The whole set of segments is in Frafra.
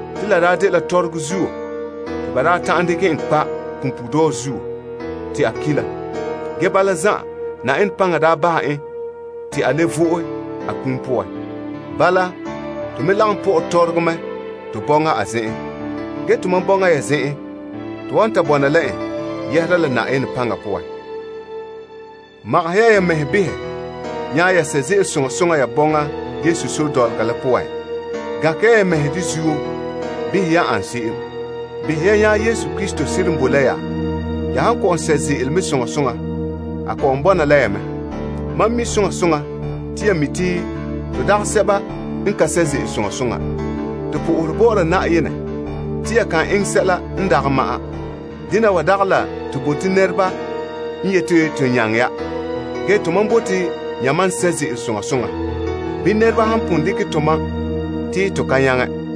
Te la dela tɔrɔgɔ zuo te ba daa ta'an dekɛ en kpa' punpuuredɔɔ zuo te a ki la. Ge bala zan'an, Na'ayenɛ paŋa daa bahɛ en te a le vo'e. Bala, to me lagom pɔ'ɛ tɔrɔgɔ mɛ to bɔŋa a zen'en. Ge tomam la yamam bɔŋa poan to wan ta bɔna la en yɛhera la Na'ayenɛ paŋa poan. Magahɛ ya, ya mɛhe behɛ nya ya sɛ' ze'ele soŋa soŋa ya bɔŋa Yesu sore dɔlɔga la poan. Gankɛ ya, ya mɛhe de zuo behɛ yan ane se'em. Behɛ ya nya Yesu Krista seren boe la ya, ya han ka lu. Mam mi soŋa soŋa te ya mi te to dagɛ sɛba n ka sɛ' ze'ele soŋa soŋa. To sohore Na'ayenɛ te ya kan eŋɛ sɛla n dagɛ ma'an. Dena wa dagɛ la to bote nɛreba n yeti to nyaŋɛ ya. Ge, tomam bote yamam n sɛ' ze'ele soŋa soŋa, bii nɛreba han pon dekɛ tomam te to ka nyaŋɛ.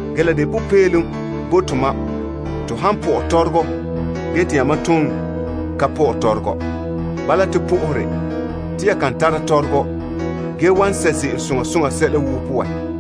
Ge la de popeelom bo tomam ton pɔ'ɛ tɔrɔgɔ ge te yamam ton ka pɔ'ɛ tɔrɔgɔ. Bala to sohore te ya kan tara tɔrɔgɔ, ge wan sɛ' ze'ele soŋa soŋa sɛla woo poan.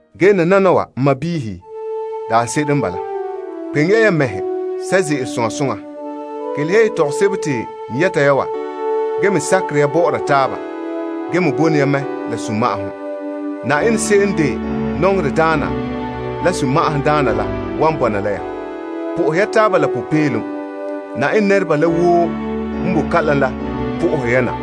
Ge nananawa, n sɔɔnrɔ, daanse'ere n bala. Kpeŋe ya, ya mɛhe sɛ' ze'ele soŋa soŋa. Kelehe ya yetɔgom sebo te n yɛta ya wa ge me sakere ya bɔ'ɔra taaba gee me bone ya mɛ la sunma'ahom. Na'ayenɛ se'em n de nɔŋerɛ daana la sunma'ahom daana la wan bɔna la ya. Po'ohɛ ya taaba la sunma'ahom kɔkerɛ Na'ayenɛ nɛreba la woo n boe kalam la po'ohere ya na.